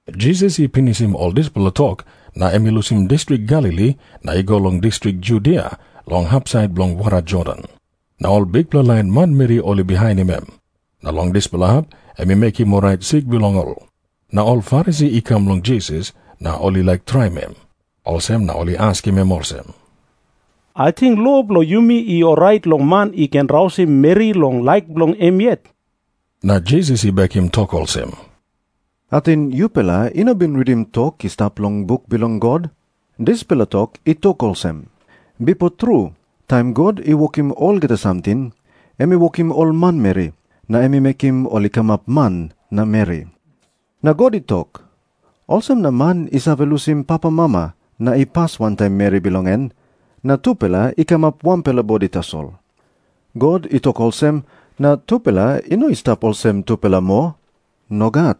Jisas i pinisim ol dispela tok, na em i lusim distrik Galili na i go long distrik Judia long hapsait bilong wara Jordan. Na ol bikpela lain manmeri ol i bihainim em. Na long dispela hap em i mekim orait sik bilong ol. Na ol Farisi i kam long Jisas na ol i laik traim em. Olsem na ol i askim em olsem, "Ating lo bilong yumi i orait long man i ken rausim meri long laik bilong em yet?" Na Jisas i bekim tok olsem, "Ating yupela i no bin ritim tok i stap long buk bilong God? Dispela tok i tok olsem, 'Bipo tru taim God i wokim olgeta samting, em i wokim ol manmeri, na em i mekim ol i kamap man na meri. Na God i tok, "Olsem na man i save lusim papamama na i pas wantaim meri bilong en, na tupela i kamap wanpela bodi tasol.' " God i tok olsem na tupela i no i stap olsem tupela moa. Nogat.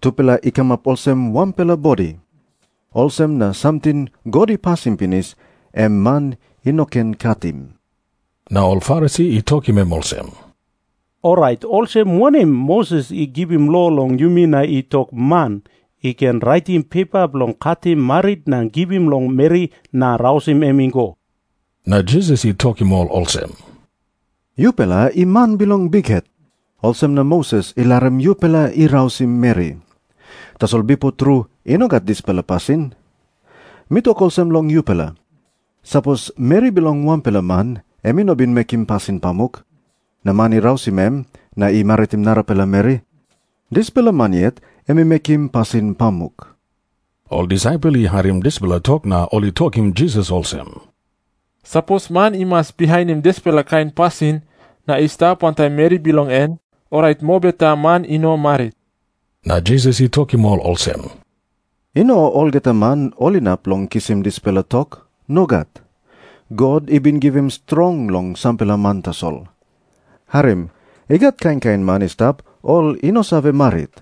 Tupela i kamap olsem wanpela bodi. Olsem na samting God i pasim pinis, em man i no ken katim." Na ol Farisi i tokim em olsem, "Orait olsem wanem Moses i givim lo long yumi na i tok man i ken raitim pepa bilong katim marit na givim long meri na rausim em i go?" Na Jisas i tokim ol olsem, "Yupela i man bilong bikhet, olsem na Moses i larim yupela i rausim meri. Tasol bipo tru i no gat dispela pasin. Mi tok olsem long yupela. Sapos meri bilong wanpela man em i no bin mekim pasin pamuk, na man i rausim em na i maritim narapela meri, dispela man yet em i mekim pasin pamuk." Ol disaipel i harim dispela tok na ol i tokim Jisas olsem, "Sapos man i mas bihainim dispela kain pasin na i stap wantaim meri bilong en, orait mobeta man i no marit." Na Jisas i tokim ol olsem, "I no olgeta man ol inap long kisim dispela tok. Nogat. God i bin givim strong long sampela man tasol. Harim. I gat kain kain man i stap ol i no save marit.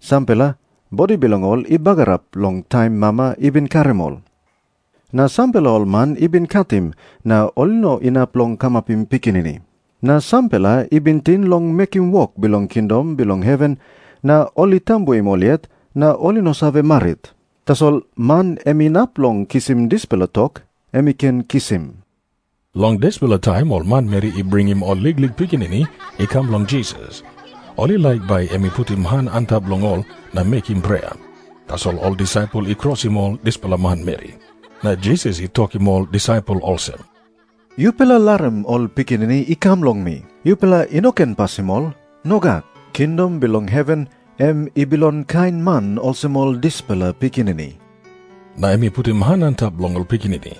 Sampela, bodi bilong ol i bagarap long taim mama i bin karim ol. Na sampela ol man i bin katim na ol i no inap long kamapim pikinini. Na sampela i bin ting long mekim wok bilong kingdom bilong heven na ol i tambuim ol yet na ol i no save marit. Tasol man em inap long kisim dispela tok, em i ken kisim." Long dispela taim ol manmeri i bringim ol liklik pikinini I kam long Jisas. Ol i laik bai em i putim han antap long ol na mekim prea. Tasol ol disaipel i krosim ol dispela manmeri. Na Jisas I tokim ol disaipel olsem, "Yupela larim ol pikinini i kam long mi. Yupela i no ken pasim ol. Nogat. Kingdom bilong heven em i bilong kain man olsem ol dispela pikinini." Na em i putim han antap long ol pikinini.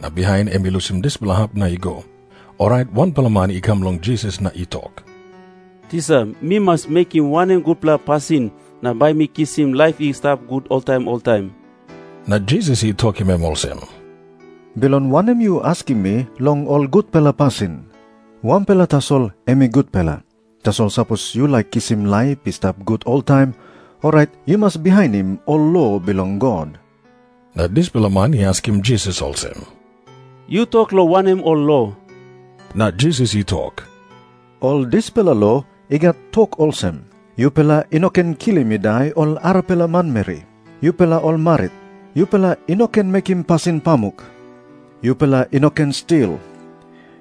Na bihain em i lusim dispela hap na i go. Orait wanpela man i kam long Jisas na i tok, "Tisa, mi mas mekim wanem gutpela pasin na bai mi kisim laip i stap gut oltaim oltaim?" Na Jisas i tokim em olsem, "Bilong wanem yu askim mi long ol gutpela pasin? Wanpela tasol em i gutpela. Tasol sapos yu laik kisim laip i stap gut oltaim, orait yu mas bihainim ol lo bilong God." Na dispela man i askim Jisas olsem, "Yu tok long wanem ol lo?" Na Jisas i tok, "Ol dispela lo i gat tok olsem, 'Yupela i no ken kilim i dai ol arapela manmeri. Yupela ol marit, yupela i no ken mekim pasin pamuk. Yupela i no ken stil.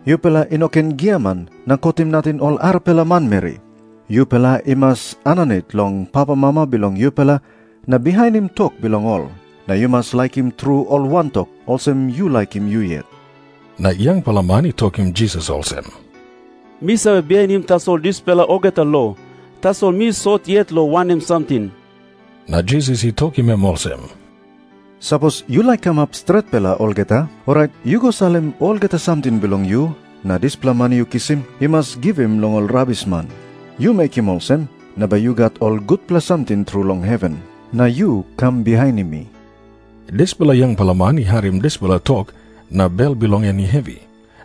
Yupela i no ken giaman na kotim nating ol arapela manmeri. Yupela i mas aninit long papamama bilong yupela na bihainim tok bilong ol. Na yu mas laikim tru ol wantok olsem yu laikim yu yet.' " Na yangpela man i tokim Jisas olsem, "Mi save bihainim tasol dispela olgeta lo. Tasol mi sot yet long wanem samting?" Na Jisas i tokim em olsem, "Sapos yu laik kamap stretpela olgeta, orait yu go salim olgeta samting bilong yu na dispela mani yu kisim yu mas givim long ol rabisman. Yu mekim olsem, na bai yu gat ol gutpela samting tru long heven. Na yu kam bihainim mi." Dispela yangpela man i harim dispela tok, na bel bilong en i hevi,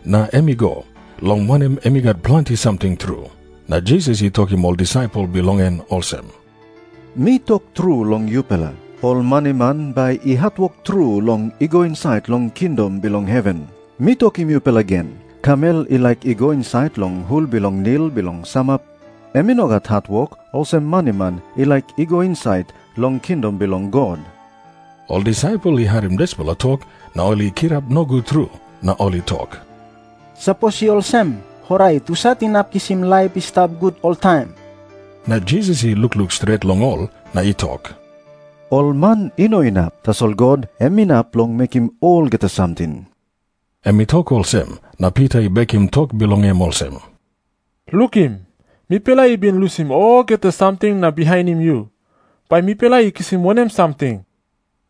na em i go. Long wanem, em i gat planti samting tru. Na Jisas i tokim ol disaipel bilong en olsem, "Mi tok tru long yupela, ol maniman bai i hatwok tru long i go insait long kingdom bilong heven. Mi tokim yupela gen, kamel i laik i go insait long hul bilong nil bilong samap, em i no gat hatwok olsem maniman i laik i go insait long kingdom bilong God." Ol disaipel i harim dispela tok na ol i kirap nogut tru. Na ol i tok, "Sapos i olsem, orait husat inap kisim laip i stap gut oltaim?" Na Jisas i lukluk stret long ol, na i tok, "Ol man i no inap. Tasol God em inap long mekim olgeta samting." Em i tok olsem, na Pita i bekim tok bilong em olsem, "Lukim. Mipela i bin lusim olgeta samting na bihainim yu. Bai mipela i kisim wanem samting?"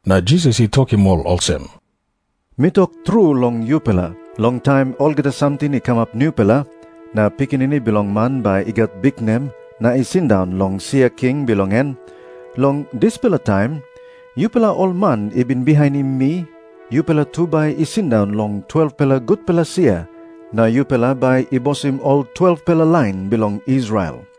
Na Jisas i tokim ol olsem, "Mi tok tru long yupela, long taim olgeta samting i kamap nupela, na Pikinini Bilong Man bai i gat biknem na i sindaun long sia king bilong en, long dispela taim yupela ol man i bin bihainim mi yupela tu bai i sindaun long 12-pela gutpela sia na yupela bai i bosim ol 12-pela lain bilong Israel.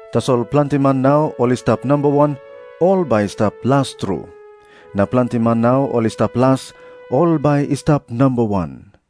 Tasol planti man nau ol i stap namba wan, ol bai i stap las tru. Na planti man nau ol i stap las, ol bai i stap namba wan."